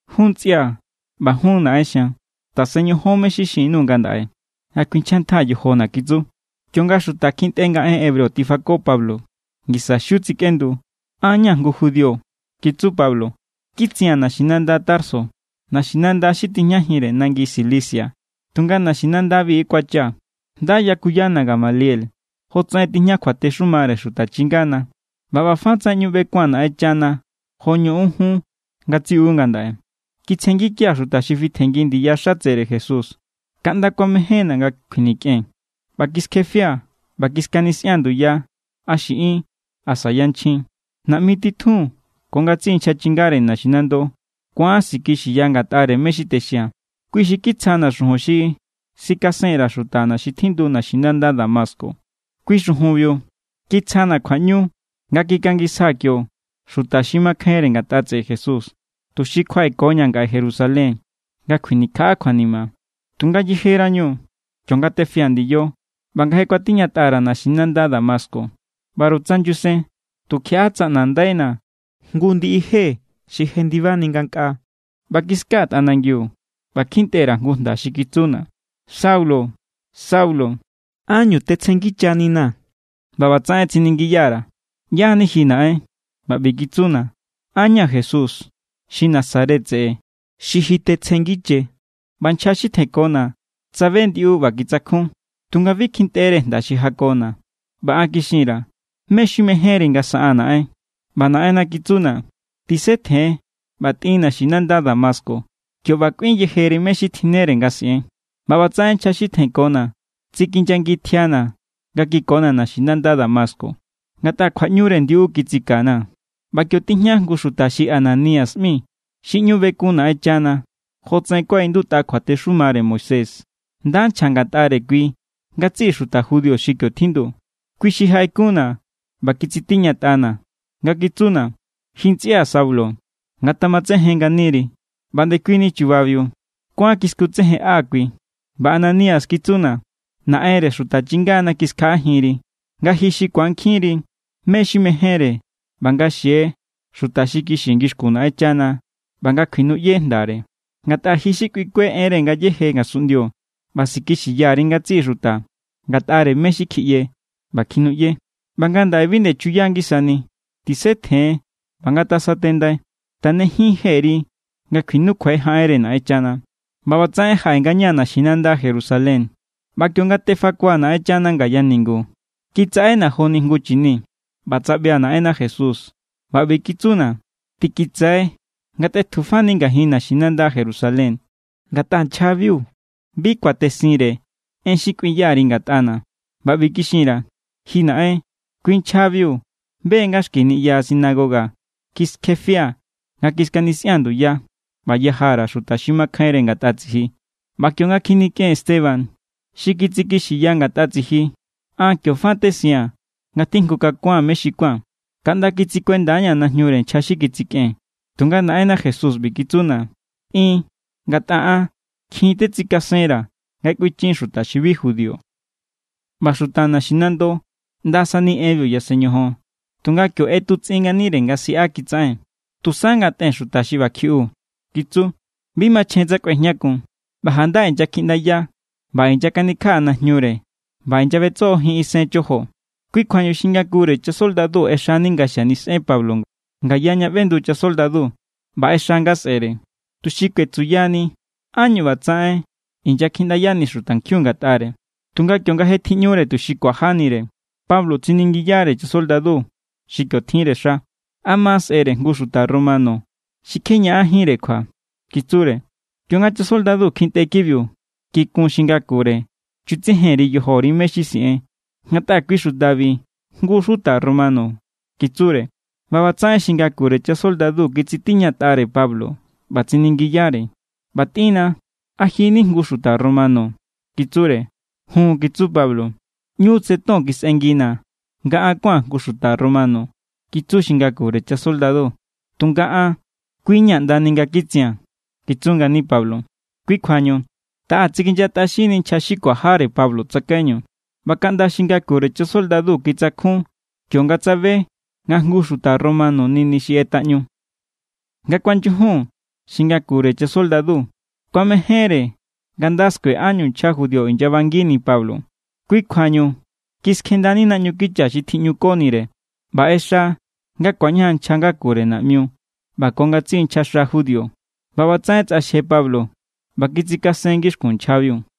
—Jun ntsꞌia̱ ꞌba jun naꞌen xian, tasen ñojon mé= xi xin_nuu̱ ngandaꞌe nga kuinchjantjaa̱ yojona̱ —kitsu. Kionga xuta kjintꞌe nga en hebreo tifako Pablo, ngisa xiu tsikꞌendu. —An= ña̱ jngu judío —kitsu Pablo—. Kitsia̱n naxinanda Tarso, naxinanda xi tijñajinre nangi Cilicia, tunga naxinandabi kuachaa̱. Nda yakuyana̱ Gamaliel jotsaꞌen tijña kjuatexumare xuta chingana. ꞌBa ꞌba fa tsaꞌen ꞌñu ꞌbekua̱n Naꞌenchana jo ñoꞌon jun ngatsiꞌu ngandaꞌe. ’Kitsjenngikia̱ xuta xi fitjenngi ndiya xatsere Jesús, kaꞌnda kuamejénna̱ nga kjuinikꞌen. ꞌBa kiskjefia̱ ꞌba kiskanisꞌia̱n nduya a xiꞌin asa yanchjin. Naꞌmi titjun ko ngatsiꞌi nchja chingare naxinando ku̱an sikixiya ngatꞌare mé= xi texia̱n. Kui xi kitsjana̱ xujun xi sikasen_ra̱ xutana xi tjindu naxinanda Damasco. Kui xujunbiu kitsjana̱ kjuaꞌñu nga kikangisjaa̱ kio xuta xi makjainre ngatꞌa tseꞌe Jesús, tuxi kjuaꞌekoña̱ ngaꞌe Jerusalén nga kjuinikjaꞌa kjuanima. ’Tunga yejerañu, kionga tefia̱ ndiyo ꞌba nga je kuatiñatꞌa_ra̱ naxinanda Damasco, ꞌbaru tsa nyusen, tukjiaꞌa tsaꞌnandaina̱ jngu ndiꞌi je xi jendibani ngankꞌaa. ꞌBa kiskaa̱ tꞌanangiu ꞌba kjintꞌe_ra̱ jngu jnda xi kitsuna̱: “Saulo, Saulo, ¿ánñu tetsjenngichaninaa̱?” ꞌBa ꞌbatsaꞌen tsiningiya_ra̱: “¿ꞌYá=ni ji, Naꞌen?” ꞌBa ꞌbi kitsuna̱: “An= ña̱ Jesús xi Nazaret tseꞌe xi ji tetsjenngiche.” ꞌBa nchja xi tjenkona̱, tsabe ndiꞌu ꞌba kitsakjun, tunga bi kjintꞌere jnda xi jakona̱. ꞌBa an kixin_ra̱: “¿Mé= xi mejénri nga saꞌaa̱n, Naꞌen?” ꞌBa Naꞌenna kitsuna̱: “Tisetjen ꞌba tꞌin naxinanda Damasco. Kio ꞌba kꞌuin yejeri mé= xi tjinnere nga siꞌen.” ꞌBa ꞌbatsaꞌen nchja xi tjenkona̱ tsikinyangi tjiana̱ nga kikona̱ naxinanda Damasco, ngatꞌa kjuaꞌñure ndiꞌu kitsikana̱. ’ꞌBa kio tijña jngu xuta xi Ananías ꞌmi xi ꞌñu bekun Naꞌenchana jotsaꞌen kuaꞌindutꞌa kjuatexumare Moisés. Nda nchja ngatꞌare kui ngatsiꞌi xuta judío xi kio tjindu. Kui xi jaꞌekunna̱ ꞌba kitsitiñatꞌana̱ nga kitsuna̱: “Ji ntsꞌia̱ Saulo, ngatamatsejen nganiri.” ꞌBa ndekuini chubabiu kuán kiskutsejenꞌa kui. ꞌBa Ananías kitsuna̱: “Naꞌenre xuta chingana kiskjaꞌajinri, nga ji xi ku̱ankjinri mé= xi mejénre ꞌba nga xie Xuta xi kixi ngixkun Naꞌenchana ꞌba nga kjuinuꞌye jndare. Ngatꞌa ji xi kꞌuikue enre ngayéje ngasunꞌndio ꞌba sikixiya_ri ngatsiꞌi xuta ngatꞌare mé= xi kjiꞌye ꞌba kjinuꞌye. ꞌBa ngandaꞌe bi nde chuya ngisani. Tisetjen ꞌba ngasatendai. Tanejin jeri nga kjuinukjue jaꞌenre Naꞌenchana.” ’ꞌBa ꞌbatsaꞌen jaꞌe ngañaa̱ naxinanda Jerusalén. ꞌBa kionga tefakua̱ Naꞌenchana ngaya ningu, kitsaꞌena̱ joni jngu chini. ꞌBa tsaꞌbia̱ Naꞌenna Jesús, ꞌba ꞌbi kitsuna̱: “Tikitsai nga tꞌetjufani ngajin naxinanda Jerusalén, ngatꞌa nchjabiu bi kuatesinre en xi kꞌuinya_ri ngatꞌana̱.” ꞌBa ꞌbi kixin_ra̱: “Ji Naꞌen, kui nchjabiu be= nga xki niꞌya sinagoga kiskjefia̱ nga kiskanisꞌia̱n nduya ꞌba yaja_ra̱ xuta xi makjainre ngatꞌa tsiji. ꞌBa kionga kjinikꞌen Esteban, xi kitsikixiya ngatꞌa tsiji, an kio fa tesiaa̱n nga tjijngukakua̱n mé xi kuán, kaꞌnda kitsikuenda=ña̱ najñure nchja xi kitsikꞌen.” Tunga Naꞌenna Jesús ꞌbi= kitsuna̱: “Tꞌin, ngatꞌa an kjin tetsikasenra̱ nga kꞌuinchin xuta xi bi judío.” ꞌBa xuta naxinando ꞌndasani enbiu yasen ñojon, tunga kio ꞌetutsꞌin nganire nga siꞌa kitsaꞌen: —¡Tusa ngatꞌen xuta xi ꞌba kjiꞌu! —kitsu—. ¡Bi machjen tsa kꞌuejñakun! ꞌBa janda inyakjiꞌndaya ꞌba inyakanikjaꞌa najñure ꞌba inyaꞌbetsojojin isen chojo. Kui kjuañu xi ngakure chasoldadu ꞌexani nga xanisꞌen Pablo ngaya ña ꞌbendu chasoldadu, ꞌba ꞌexa nga sꞌe̱re, tuxi kuetsuyani ánñu ꞌbatsaꞌen inyakjiꞌndayani xutankjiun ngatꞌare. Tunga kionga je tjiꞌñure tuxi kuajanire, Pablo tsiningiyare chasoldadu xi kio tjinre xa: —¿A ma seꞌere jngu xuta romano xi kje ñaꞌanjínre kjua? —kitsure. Kionga chasoldadubiu kjintꞌe kibiu, kikun xi ngakure. —Chutsejen_ri yojori mé= xi siꞌen, ngatꞌa kui xutabi jngu= xuta romano —kitsure. ꞌBa ꞌbatsaꞌen xi ngakure chasoldadu kitsitiñatꞌare Pablo ꞌba tsiningiyare: —ꞌBa tꞌínna, ¿a ji= ni jngu xuta romano? —kitsure. —Jun —kitsu Pablo. —ꞌÑu tse ton kisꞌengina̱ an nga kuán jngu xuta romano —kitsu xi ngakure chasoldadu. —Tunga an, kui= ña̱ ꞌnda nga kitsia̱n —kitsu ngani Pablo. Kui kjuañu taꞌa tsikinyatꞌaxinni nchja xi kuajare Pablo tsakaiñu, ꞌba kaꞌnda xi ngakure chasoldadu kitsakjun kionga tsabe nga jngu xuta romano= nini xi ꞌetaꞌñu. Nga kuanyujun, xi ngakure chasoldadu kuamejénre nga nda skue ánñu nchja judío inyabangini Pablo. Kui kjuañu kiskjendani naꞌñu kicha xi tjíꞌñukonire ꞌba ꞌexa nga ku̱añajan nchja ngakure naꞌmiu ꞌba ko ngatsiꞌi nchjaxa judío. ꞌBa ꞌbatsaꞌen tsꞌaxje Pablo ꞌba kitsikasen ngixkun nchjabiu.